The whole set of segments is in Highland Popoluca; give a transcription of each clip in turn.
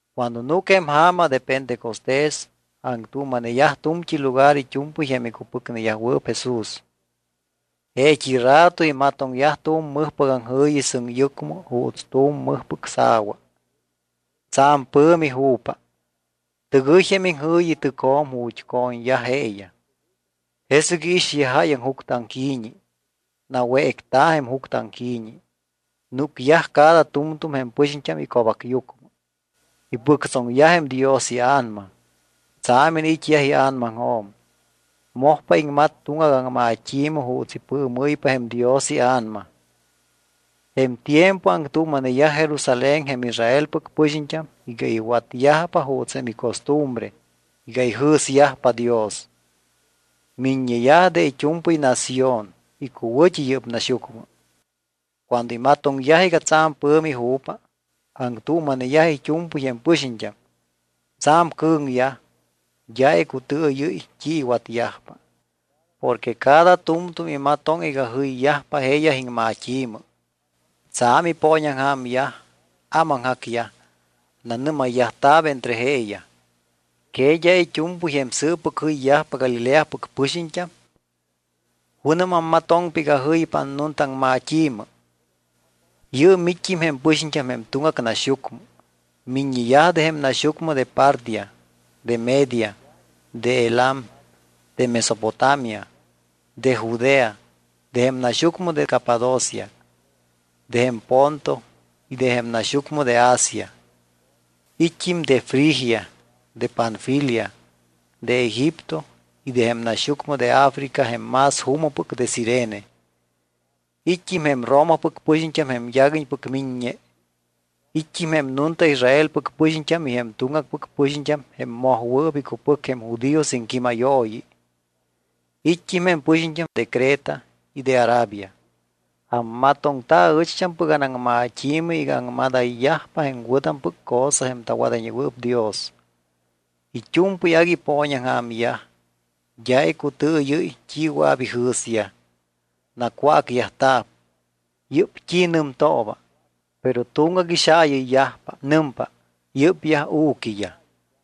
Cuando núc jém ja̱ma de pentecostés, aŋtuuma̱neyaj tu̱mt́i lugar it́u̱mpɨy jém icupɨcneyajwɨɨp Jesús. Jeet́i rato imatoŋyaj tu̱m mɨjpɨc aŋjɨ̱yi sɨŋyucmɨ juuts tu̱m mɨjpɨc sa̱wa. Tsa̱m pɨ̱mi ju̱pa. Tɨgɨy jém iŋjɨ̱yi tɨcjo̱m ju̱t́ co̱ñyaj jeeyaj. Jesɨc iixyaj jáyaŋ juctɨaŋqui̱ñi. Nawécta̱ jém juctɨaŋqui̱ñi, núcyaj cada tu̱mtu̱m jém pɨxiñt́am ico̱bacyucmɨ. Ipɨctsoŋyaj jém Dios iA̱nama, tsa̱m iniit́ ia̱namaŋjo̱m. Mojpa iŋmat tuŋgac aŋmat́i̱mɨ juuts ipɨɨmɨ́ypa jém Dios iA̱nama. Jém tiempo aŋtuuma̱neyaj Jerusalén jém Israelpɨc pɨxiñt́am iga iwatyajpa juuts jém icostumbre iga ijɨ̱syajpa Dios. Miññeyaj de it́u̱mpɨy nación icuwɨ̱t́i yɨ́p naxyucmɨ. Cuando imatoŋyaj iga tsa̱m pɨ̱mi ju̱pa, aŋtuuma̱neyaj it́u̱mpɨy jém pɨxiñt́am. Tsa̱m cɨ̱ŋyaj, d́a icutɨɨyɨ́y t́i iwatyajpa porque cada tu̱mtu̱m imatoŋ iga jɨyyajpa jeeyaj iŋmat́i̱mɨ. Tsa̱m ipooñaŋja̱myaj, ámaŋjacyaj. Nanɨ́mayyajta̱p entre jeeyaj: —¿Que d́a it́u̱mpɨy jém sɨɨppɨc jɨyyajpa Galileapɨc pɨxiñt́am? ¿Junɨm ammatoŋtámpa iga jɨypa annuntaaŋmat́i̱mɨ? Yɨɨm it́t́im jém pɨxiñt́am de tuŋgac naxyucmɨ. Miññeyaj de jém naxyucmɨ de Partia, de Media, de Elam, de Mesopotamia, de Judea, de jém naxyucmɨ de Capadocia, de jém Ponto y de jém naxyucmɨ de Asia. It́t́im de Frigia, de Panfilia, de Egipto y de jém naxyucmɨ de África jém más juumɨpɨc de Cirene. It́t́im jém Romapɨc pɨxiñt́am jém yaguiñpɨc miññe. It́t́im jém nunta Israelpɨc pɨxiñt́am y jém tuŋgacpɨc pɨxiñt́am jém mojwɨɨp icupɨc jém judíos iŋquímayooyi. It́t́im jém pɨxiñt́am de Creta y de Arabia. Ammatoŋta aɨcht́ampɨc anaŋmat́i̱mɨ iga aŋmadayyajpa jém wɨ̱tampɨc cosa jém tawadayñewɨɨp Dios. It́u̱mpɨy agui ipooñaŋja̱myaj. D́a icutɨɨyɨ́y t́i wɨa̱p ijɨ̱syaj. Nacwácyajta̱p: —¿Yɨ́p t́i nɨmtooba? Pero tuŋgac ixaayɨyyajpa. Nɨmpa: —Yɨ́pyaj u̱quiyaj.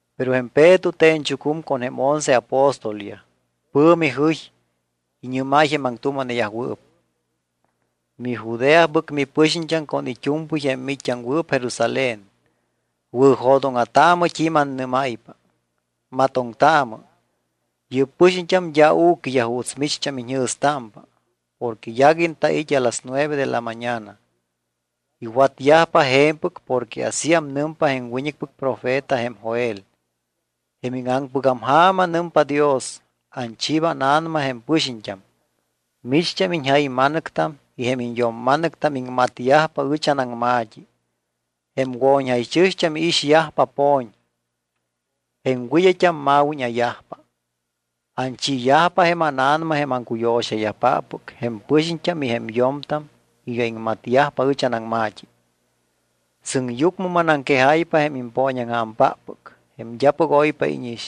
Pero jém Peto te̱ñchucum con jém once apóstolyaj. Pɨ̱mi jɨy. Iñɨ́máy jém aŋtuuma̱neyajwɨɨp: —MiJudeapɨc mipɨxiñt́am con iñt́u̱mpɨy jém miit́t́aŋwɨɨp Jerusalén, wɨ̱jo̱dóŋa̱taamɨ t́i mannɨ́máypa. Matoŋtaamɨ. Yɨ́p pɨxiñt́am d́a u̱quiyaj juuts micht́am iñjɨ̱stámpa porque yaguiñ tait́ a las nueve de la mañana. Iwatyajpa je̱mpɨc porque asíam nɨmpa jém wiñɨcpɨc profeta jém Joel: Jém íŋaŋpɨgam ja̱ma, nɨmpa Dios, anchiiba ánA̱nama jém pɨxiñt́am. Micht́am iñjayma̱nɨctam y jém iñyo̱mma̱nɨctam iŋmatyajpa ɨch anaŋma̱t́i. Jém wo̱ñjaychɨ̱xt́am iixyajpa po̱ñ. Jém wɨd́ayt́am ma̱wíña̱yajpa. Anchiiyajpa jém ánA̱nama jém acuyo̱xayajpáppɨc jém pɨxiñt́am y jém yo̱mtam iga iŋmatyajpa ɨch anaŋma̱t́i. Sɨŋyucmɨ manaŋquejáypa jém impooñaŋja̱mpáppɨc jém d́apɨc oypa íñix.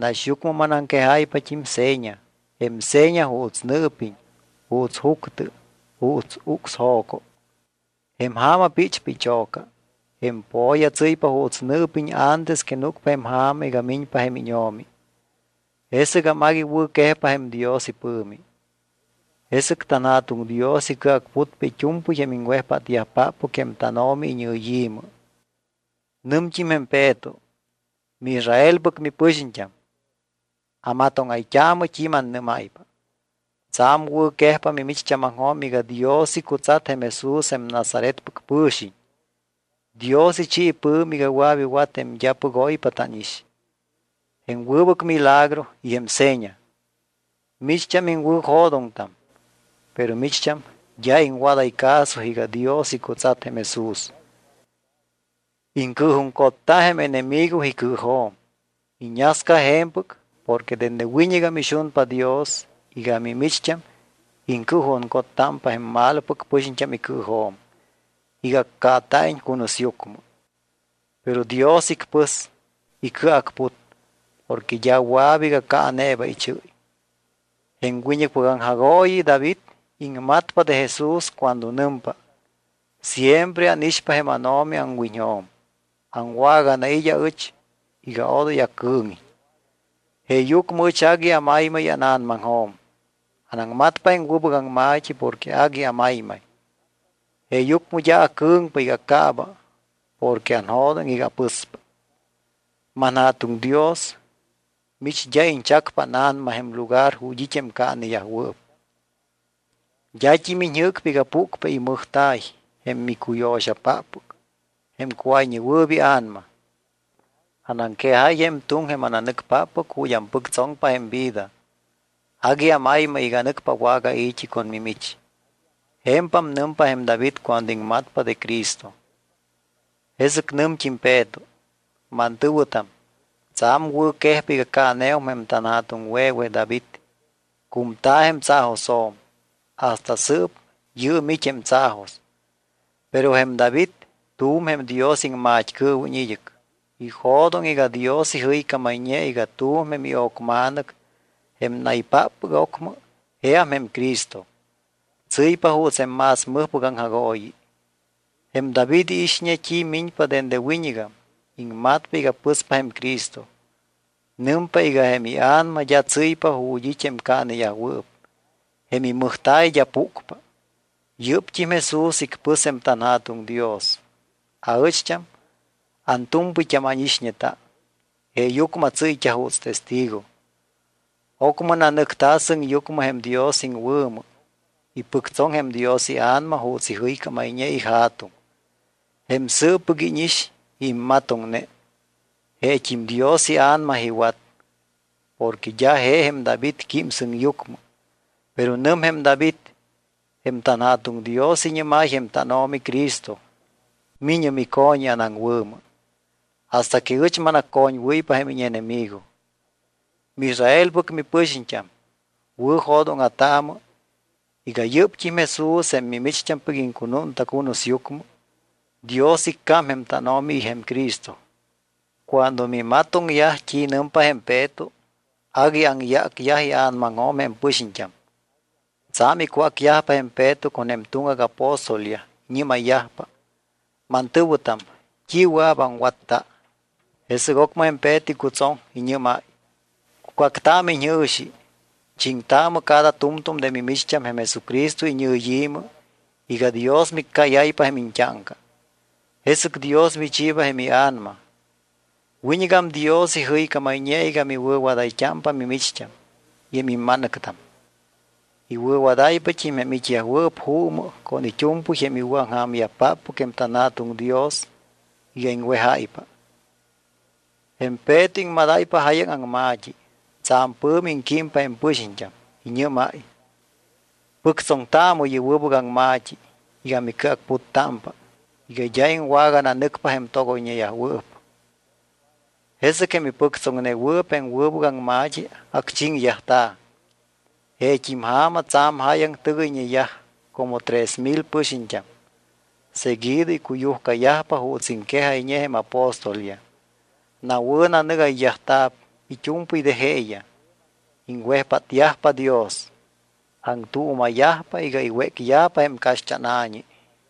Naxyucmɨ manaŋquejáypat́im seña. Jém seña juuts nɨɨpiñ, juuts juctɨ, juuts ucsjo̱co. Jém ja̱ma píchpa icho̱ca, jém po̱ya tsɨ́ypa juuts nɨɨpiñ antes que núcpa jém ja̱ma iga miñpa jém íñO̱mi. Jesɨgam agui wɨ̱quejpa jém Dios ipɨ̱mi. Jesɨc tanJa̱tuŋ Dios icɨacputpa it́u̱mpɨy jém iŋwejpátyajpáppɨc jém tánO̱mi iñɨyi̱mɨ. Nɨmt́im jém Peto: —MiIsraelpɨc mipɨxiñt́am, amatóŋayt́aamɨ t́i mannɨ́máypa. Tsa̱m wɨ̱quejpa mimicht́ámaŋjo̱m iga Dios icutsat jém Jesús jém Nazaretpɨc pɨ̱xiñ. Dios ichi ipɨ̱mi iga wɨa̱p iwat jém d́apɨc oypa tánix, jém wɨbɨc milagro y jém seña. Micht́am iŋwɨ̱jo̱doŋtam. Pero micht́am d́a iŋwadáy caso iga Dios icutsat jém Jesús. Iŋcɨɨjuŋcotta jém enemigo icɨɨjo̱m. Iñasca je̱mpɨc porque dende wiñɨgam ixunpa Dios iga mimicht́am iŋcɨɨjuŋcottámpa jém malopɨc pɨxiñt́am icɨɨjo̱m iga accaata̱iñ cunusyucmɨ. Pero Dios icpɨs. Icɨacput. Porque d́a wɨa̱p iga caaneeba ichɨ́y. Jém wiñɨcpɨc aŋjagooyi David iŋmatpa de Jesús cuando nɨmpa: Siempre ánixpa jém ánO̱mi aŋwiñjo̱m. Awaganait́ aɨch iga odoy acɨɨŋiñ. Jeeyucmɨ ɨch agui amaymay ána̱namaŋjo̱m. Anaŋmatpa jém wɨbɨc aŋma̱t́i porque agui amaymay. Jeeyucmɨ d́a acɨ̱ŋpa iga acaaba porque anjo̱doŋ iga apɨspa. ManJa̱tuŋ Dios, mich d́a iñchacpa ána̱nama jém lugar ju̱t́ it́ jém caaneyajwɨɨp. D́at́im iñjɨ́cpa iga púcpa imɨjta̱y jém micuyo̱xapáppɨc jém Cuáyñewɨɨp iA̱nama. Anaŋquejáy jém tuŋ jém ananɨcpáppɨc ju̱t́ ampɨctsoŋpa jém vida. Agui amaymay iga nɨcpa awagai̱t́i con mimich. Je̱mpam nɨmpa jém David cuando iŋmatpa de Cristo. Jesɨc nɨmt́im Peto: —Mantɨ̱wɨtam, tsa̱m wɨ̱quejpa iga caaneum jém tanja̱tuŋwe̱we David, cumta̱ jém tsaajosjo̱m. Hasta sɨɨp yɨɨm it́ jém tsaajos. Pero jém David tu̱m jém Dios iŋmat́cɨɨwiñ id́ɨc. Ijo̱doŋ iga Dios ijɨycámayñe iga tu̱m jém io̱cma̱nɨc, jém naypáppɨc ocmɨ, jeam jém Cristo. Tsɨ́ypa juuts jém más mɨjpɨc aŋjagooyi. Jém David iixñe t́i miñpa dende wiñɨgam. Iŋmatpa iga pɨspa jém Cristo. Nɨmpa iga jém ia̱nama d́a tsɨ́ypa ju̱t́ it́ jém caaneyajwɨɨp, jém imɨjta̱y d́a púcpa. Yɨ́pt́im Jesús icpɨs jém tanJa̱tuŋ Dios. Aɨcht́am antu̱mpɨyt́am ánixñeta. Jeeyucmɨ atsɨ́yt́a juuts testigo. Ocmɨ nanɨcta̱ sɨŋyucmɨ jém Dios iŋwɨ̱mɨ. Ipɨctsoŋ jém Dios iA̱nama juuts ijɨycámayñe iJa̱tuŋ. Jém sɨɨppɨc íñix y immatoŋne, jeet́im Dios iA̱nama iwat. Porque d́a je jém David quím sɨŋyucmɨ, pero nɨm jém David: Jém tanJa̱tuŋ Dios iñɨ́máy jém tánO̱mi Cristo: “Mi̱ñɨ mico̱ñi anaŋwɨ̱mɨ, hasta que ɨch manaccoñwɨ́ypa jém íñenemigo.” ’MiIsraelpɨc mipɨxiñt́am, wɨ̱jo̱dóŋa̱taamɨ iga yɨ́pt́im Jesús, jém micht́ampɨc iŋcunúnta cunusyucmɨ, Dios iccám jém tánO̱mi y jém Cristo. Cuando mimatoŋyaj t́i nɨmpa jém Peto, agui aŋyácyaj ia̱namaŋjo̱m jém pɨxiñt́am. Tsa̱m icwácyajpa jém Peto con jém tuŋgac apóstolyaj. Iñɨ́mayyajpa: —Mantɨ̱wɨtam, ¿t́i wɨa̱p aŋwatta? Jesɨc ocmɨ jém Peto icutsoŋ. Iñɨ́máy: —Cucactaamɨ iñjɨ̱xi. Chiŋtaamɨ cada tu̱mtu̱m de mimicht́am jém Jesucristo iñɨyi̱mɨ iga Dios miccáyáypa jém iñt́áŋca. Jesɨc Dios michiiba jém iA̱nama. Wiñɨgam Dios ijɨycámayñe iga miwɨ̱wadáypa mimicht́am y jém imma̱nɨctam. Iwɨ̱wadáypat́im jém it́yajwɨɨp juumɨ con it́u̱mpɨy jém iwɨ̱aŋja̱myajpáppɨc jém tanJa̱tuŋ Dios iga iŋwejáypa. Jém Peto iŋmadáypa jáyaŋ aŋma̱t́i. Tsa̱m pɨ̱mi iŋquímpa jém pɨxiñt́am. Iñɨ́máy: —Pɨctsoŋtaamɨ yɨ́p wɨbɨc aŋma̱t́i iga micɨacputtamta̱p iga d́a iŋwagananɨcpa jém togoyñeyajwɨɨp. Jesɨc jém ipɨctsoŋnewɨɨp jém wɨbɨc aŋma̱t́i acchiŋyajta̱. Jeet́im ja̱ma tsa̱m jáyaŋ tɨgɨyñeyaj, como tres mil pɨxiñt́am. Seguido icuyujcayajpa juuts iŋquejayñe jém apóstolyaj. Nawɨ̱nanɨgayyajta̱p it́u̱mpɨy de jeeyaj. Iŋwejpátyajpa Dios. Aŋtuuma̱yajpa iga iwécyajpa jém caxt́ána̱ñi.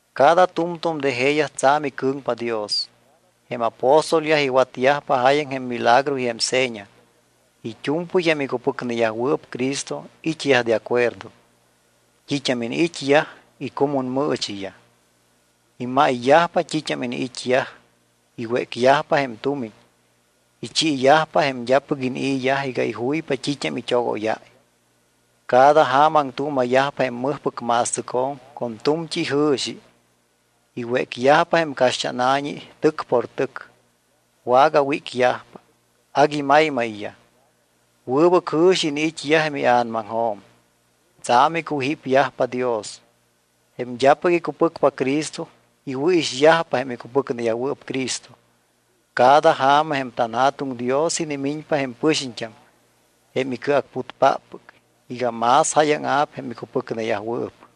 Cada tu̱mtu̱m de jeeyaj tsa̱m icɨ̱ŋpa Dios. Jém apóstolyaj iwatyajpa jáyaŋ jém milagro y jém seña. It́u̱mpɨy jém icupɨcneyajwɨɨp Cristo it́yaj de acuerdo. T́it́am iniit́yaj icumunmɨɨchiyaj. Imayyajpa t́it́am iniit́yaj. Iwécyajpa jém tumiñ, ichiiyajpa jém d́apɨc inii̱yaj iga ijuypa t́it́am it́ogóyáy. Cada ja̱ma aŋtuuma̱yajpa jém mɨjpɨc ma̱stɨcjo̱m con tu̱mt́i ijɨ̱xi. Iwécyajpa jém caxt́ána̱ñi tɨc por tɨc. Wagawícyajpa. Agui maymayyaj. Wɨbɨc jɨ̱xi iniit́yaj jém ia̱namaŋjo̱m. Tsa̱m icujípyajpa Dios. Jém d́apɨc icupɨcpa Cristo iwɨ̱ixyajpa jém icupɨcneyajwɨɨp Cristo. Cada ja̱ma jém tanJa̱tuŋ Dios inimiñpa jém pɨxiñt́am jém icɨacputpáppɨc iga más jáyaŋa̱p jém icupɨcneyajwɨɨp.